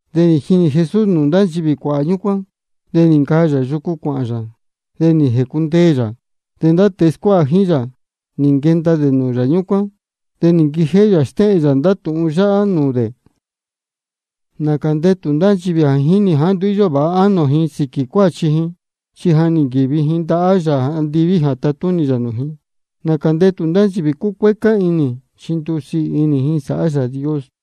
De nī jinī Jesús nūū ndá nchivī cuāhā ñúcuán. De nī ncaa yā yucu cuāhān yā, de nī jēcundeē yā. De ndá tēe scuáha jíín yā, nī nquenda dē nūū yā ñúcuán. De nī nquijéhé yā nī stéhēn yā ndá tūhun yáhá nūū dē: Nācā ndetū ndá nchivī jā jínī ji jāá nduú íyó vāha ánō ji sīquī cuáchi ji, chi ja nī nquīvi ji ndahá Yāā andiví jā tatúnī yā nūū ji. Nācā ndetū ndá nchivī cúcuécá inī, chi ndusiī inī ji sāhá Yāā Dios.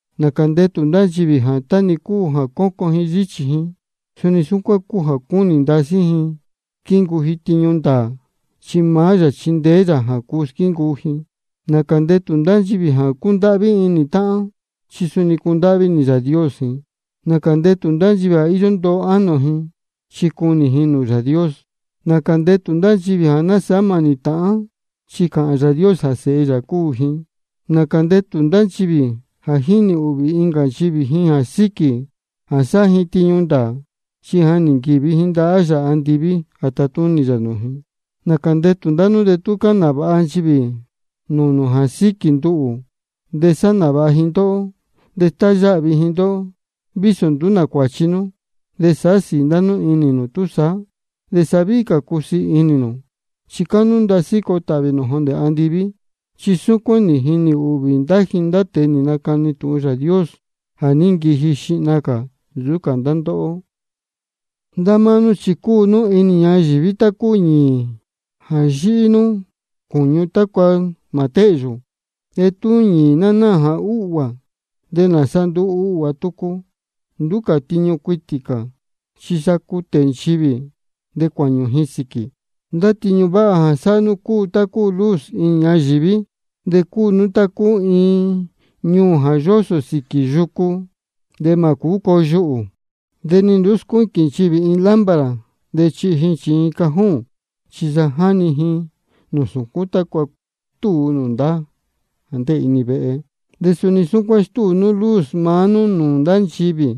Nācā ndetū ndá nchivī jā tá-ni cúu jā cócon ji yíchī ji, suni súcuán cúu jā cúnī ndasí ji squíncuu ji tiñu ndāā, chi maá yā chindeé yā jā cuu squíncuu ji. Nācā ndetū ndá nchivī jā cúndáhví inī táhán, chi suni cundáhví inī Yāā Dios ji. Nācā ndetū ndá nchivī jā íyó ndoo inī ánō ji, chi cunī ji nūū Yāā Dios. Nācā ndetū ndá nchivī jā násāhá mānī táhán, chi cāhān Yāā Dios jā sēhe yā cúu ji. Nācā ndetū ndá nchivī jā jínī ūhvī incā nchivī ji sīquī jā sáhá ji tiñu ndāā, chi ja nī nquīvi ji ndahá Yāā andiví jā tatúnī yā nūū ji. Nācā ndetū ndá nú tú cáhān nāvāha ji nūū nū jā síquī nduhū, de sáhá nāvāha ji ndóhó, de stáyáhvi ji ndóhó, vísō nduú nā cuāchi nú. De sāhá sīī ndá nú inī nū túsaá, de sa víhí cā cusiī inī nū, chi cáhnú ndasí coo tāhvī nū jondē andiví. Chi suni súcuán nī jinī ūhvī ji ndá tēe nī nacani tūhun Yāā Dios jā ní nquiji xihna cā nsūú cā ndá ndóhó. Ndá máá nú chi cúu nú inī ñayīví tá cúu ñīī jā yíhí nūū cūñu tácua mā téhyū. De tú ñīī ná náā jā úhguā, ¿de nāsa nduu uhguā tucu? Nduú cā tiñu cuitī cā, chi sa cutē nchivī de cuāñū ji sīquī. Ndá tiñu váha jā sáhá nú cúu tá cúu luz inī ñayīví. De cúu nú tá cúu iin ñuū jā yósō xīnī yūcú, de mā cūú coo yuhū. De ni nduú scuíquīn nchivī iin lámpara de chihi ji chījin cajón, chi sa jáni ji nūū sūcún tácua stúu nūū ndá jā ndéē inī vehe. De suni súcuán stéhēn nū luz maá nú nūū ndá nchivī,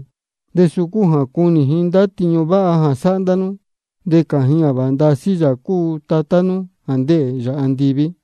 de suu cúu jā cunī ji ndá tiñu váha sáhá ndá nú, de cāhān ji jā vāha ndasí Yāā cúu Tatá nú jā ndéē yā andiví.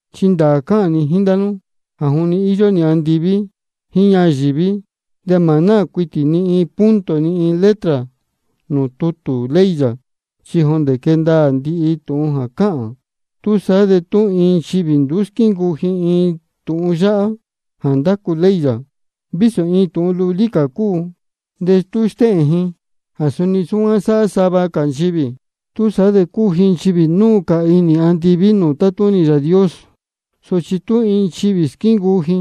Chi ndāā cáhān ni jíín ndá nú jā juni íyó andiví jíín ñayīví, de mā náā cuitī ni iin punto ni iin letra nūū tutū ley yā, chi jondē quee ndaā ndihi tūhun jā cáhān. Túsaá de tú iin nchivī nduú squíncuu ji iin tūhun yáhá jā ndácu ley yā, vísō iin tūhun lulí cā cúu, de tú stéhēn ji jā suni súcuán sāhá sava cā nchivī, túsaá de cuu ji nchivī núu cā inī andiví nūū tátúnī Yāā Dios. Sochi tú iin nchivī squíncuu ji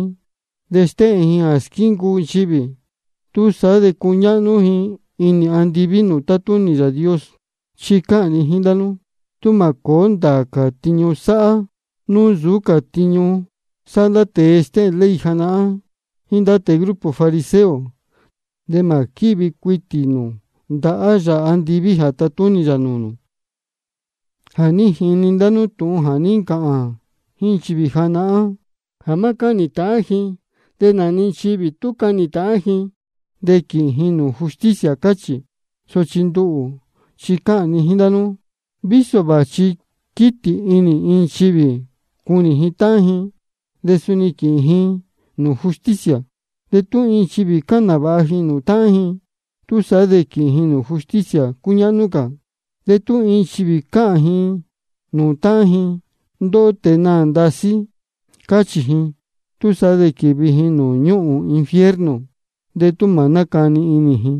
de stéhēn ji jā squíncuu nchivī, túsaá de cuñáhnú ji inī andiví nūū tátúnī Yāā Dios. Chi cáhān ni jíín ndá nú, tú mā cōó ndāā cā tiñu sáhá nú nsūú cā tiñu sáhá ndá tēe stéhēn ley janahán jíín ndá tēe grupo fariseo, de mā quívi cuitī nū ndahá Yāā andiví jā tatúnī yā nūū nū. Ja nī jini ndá nú tūhun jā ní ncāhān jíín nchivī janahán jā má cáhnī ji ndīyi, de nā-ni nchivī tú cahnī ji ndīyi, de quīhīn ji nūū justicia, cáchī. Sochi nduhū chi cáhān ni jíín ndá nú, vísō vāchi jā quītī inī iin nchivī cunī ji táhán ji, de suni quīhīn ji nūū justicia. De tú iin nchivī cāhān nāvāha ji nūū táhán ji, túsaá de quīhīn ji nūū justicia cúñáhnú cā. De tú iin nchivī cāhān ji nūū táhán ji: Ndóhó tēe naā ndasí, cachī ji, túsaá de quīvi ji nūū ñúhūn infierno de tú mā nácani inī ji.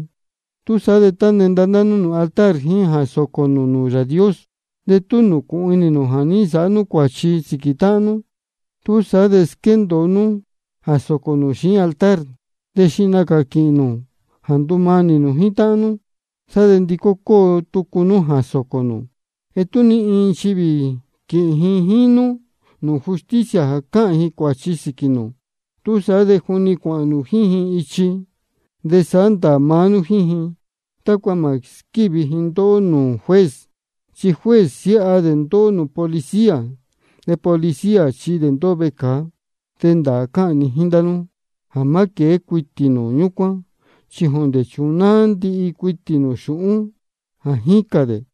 Túsaá de tá quenda ndá nú nūū altar jíín jā sōcō nū nūū Yāā Dios, de tú nūcūhun inī nū jā ní nsāhá nú cuāchi sīquī táhán nú, túsaá de squéndōo nú jā sōcō nū xiín altar, de xihna cā quīhīn nū jā ndumanī nū jíín táhán nú. De sá de ndicó cóo tucu nú jā sōcō nū. De tú iin nchivī quīhīn ji jíín nú nūū justicia jā cāhān ji cuāchi sīquī nū, túsaá de juni cuāhān nū jíín ji ichi de sāhá ndāā maá nú jíín ji, tácua mā squívi ji ndóhó nūū juez. Chi juez siáha dē ndóhó nūū policía, de policía chihi dē ndóhó vecāa. De ndāā cáhān ni jíín ndá nú jā má quēé cuitī nū ñúcuán chi jondē chunáá nú ndihi cuitī xūhún jā jícān ndá dē.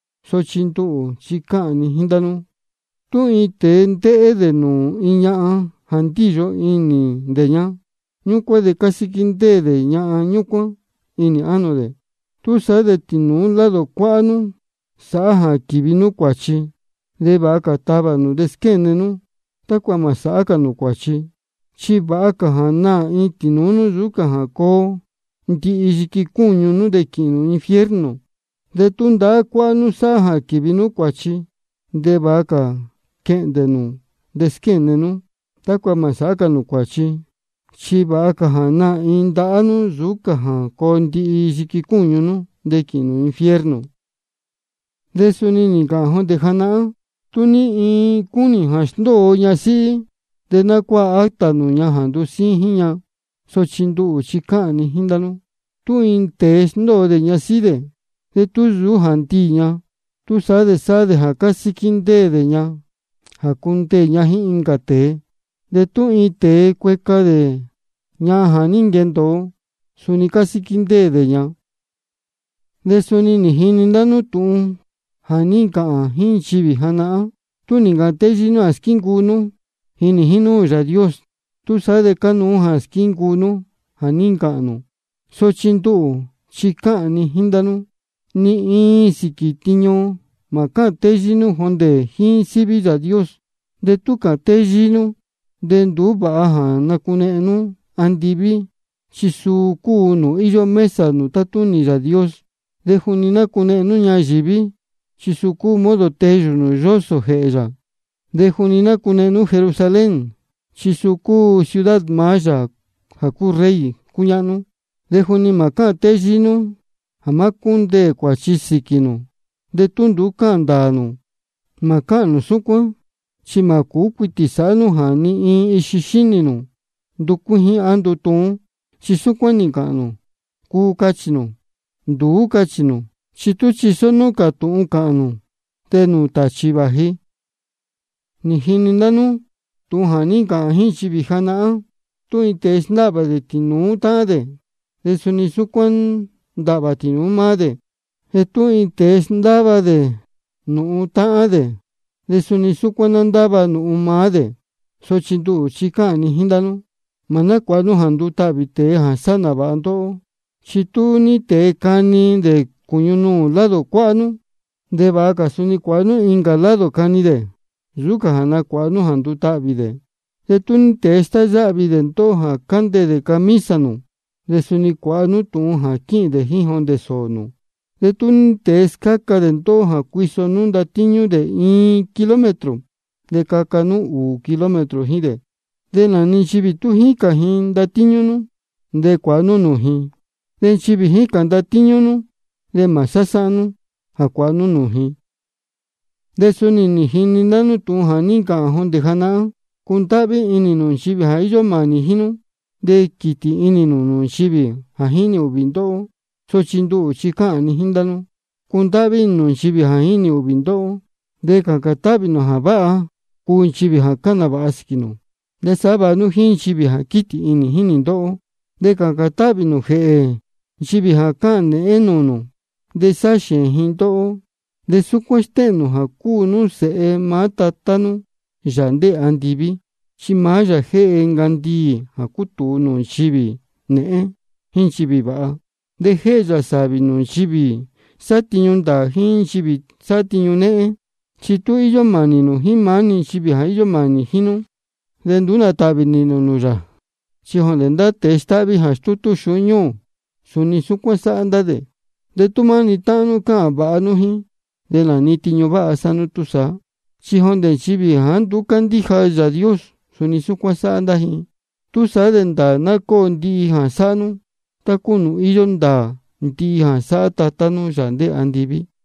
Sochi nduhū chi cáhān ni jíín ndá nú jā tú iin tēe ndéhé dē nūū iin ñahan jā ndíyo inī dē ña, ñúcuán de ja nī ncasíquí ndéē dē ñahan ñúcuán inī ánō dē. Túsaá de tú tīnūú lado cuáhá nú sáhá jā quīvi nú cuāchi, de vāha cā tavā nū de squéne nú, tácua mā sāhá cā nū cuāchi. Chi vāha cā jā naā iin tīnūú nú nsūú cā jā coo ndihi yiqui cúñu nú de quīhīn nū infierno. De tú ndahá cuáhá nú sáhá jā quīvi nú cuāchi, de vāha cā quehndē nū de squéne nú, tácua mā sāhá cā nū cuāchi. Chi vāha cā jā naā iin ndahá nú nsūú cā jā coo ndihi yiqui cúñu nú de quīhīn nū infierno. De suni nī ncāhān jondē janahán: Tú ní iin cúnī jā sndóo ñasíhí, de ná cuáha acta nūū ña jā ndusíín jíín ña. Sochi nduhū chi cáhān ni jíín ndá nú, tú iin tēe sndóo dē ñasíhí dē, de tú nsūú jā ndiī ña, túsaá de sáhá dē jā casíquí ndéē ña jā cundeē ña jíín incā tēe. De tú iin tēe cueca dē ñahan jā ní nquendōo, suni cásíquí ndéē dē ña. De suni nī jini ndá nú tūhun jā ní ncāhān jíín nchivī janahán: Tú nī ncāhān téyíí nú jā squíncuu nú, jínī jínúū Yāā Dios, túsaá de cánuú jā squíncuu nú jā ní ncāhān nū. Sochi nduhū chi cáhān ni jíín ndá nú jā ni iin sīquī tiñu mā cáhān téyíí nú jondē jíín síví Yāā Dios. De tú cāhān téyíí nú de nduú vāha jā nacunehen nú andiví, chi suu cúu nūū íyó mesa nūū tátúnī Yāā Dios. De juni mā nácunehen nú ñayīví, chi suu cúu modo teyū nūū yósō jēhē yā. De juni mā nácunehen nú Jerusalén, chi suu cúu ciudad maá Yāā jā cúu Rey cúñáhnú. De juni mā cáhān téyíí nú jā ná cúndeē cuāchi sīquī nū de tú nduú cáhān ndāā nū. Mā cáhān nū súcuán, chi mā cūú cuitī sāhá nú jā ni iin ixi xínī nū nducuíjín á ndutuún. Chi súcuán-ni cāhān nū: Cuu, cachī nū. Nduú, cachī nū. Chi tú chisó nú cā tūhun cāhān nū, de nūū tāchī vāji. Nī jini ndá nú tūhun jā ní ncāhān jíín nchivī janahán: Tú iin tēe sndáhvā dē tīnūú táhán dē, de suni súcuán ná ndáhvā tīnūú maá dē. De tú iin tēe sndáva dē nūhun táhán dē, de suni súcuán ná ndáva nūhun maá dē. Sochi nduhū chi cáhān ni jíín ndá nú: Mā nácuāha nú jā ndutahvī tēe jā sáhá nāvāha ndóhó. Chi tú ní tēe cani dē cūñu nuū lado cuáhá nú, de vāha cā suni cuāha nú incā lado cani dē, nsūú cā jā nacuāha nú jā ndutahvī dē. De tú ní tēe stáyáhvi dē ndóhó de candeē dē camisa nū, de suni cuāha nú tūhun jā quīhīn dē jíín jondē sōō nū. De tú ní tēe scáca dē ndóhó jā cuiso nú ndatíñú dē iin kilómetro, de caca nú ūū kilómetro jíín dē. De nā-ni nchivī tú jícān ji ndatíñú nú, de cuāha nú nūū ji. De nchivī jícān nūú ndatíñú nú, de mā sásáhán nú jā cuāha nú nūū ji. De suni nī jini ndá nú tūhun jā ní ncāhān jondē janahán: Cundáhví inī nū nchivī jā íyó mānī jíín nú, de quītī inī nū nūū nchivī jā jínī ūhvī ndóhó. Sochi nduhū chi cáhān ni jíín ndá nú: Cundáhví inī nū nchivī jā jínī ūhvī ndóhó. De cācān táhvī nū jā váha cuu nchivī jā cáhān nāvāha sīquī nū. De sāhá vāha nú jíín nchivī jā quítī inī jínī ndóhó. De cācān táhvī nū jēhē nchivī jā cáhān nēhén nūū nū de sáhá xēēn ji ndóhó. De súcuán stéhēn nū jā cúu nú sēhe maá Tatá nú, Yāā ndéē andiví, chi maá yā jéhe ncandiī jā cutūu nūū nchivī nēhén jíín nūū nchivī vāha. De jéhe yā sāvī nūū nchivī sáhá tiñu ndāā jíín nūū nchivī sáhá tiñu néhén. Chi tú íyó mānī nū jíín maá-ni nchivī jā mānī jíín nú, de nduú nā tāhvī nīhīn nū nūū yā. Chi jondē ndá tēe stáhví jā stútú xūhún ñúū, suni súcuán sáhá ndá dē. De tú maá-ni táhán nú cáhān vāha nú jíín, ¿de nā tiñu váha sáhá nú túsaá? Chi jondē nchivī jāá nduú cándíja Yāā Dios, suni súcuán sáhá ndá ji. Túsaá de ndāā ná cóo ndihi jā sáhá nú, tá cúu nūū íyó ndāā ndihi jā sáhá Tatá nú, Yāā ndéē andiví.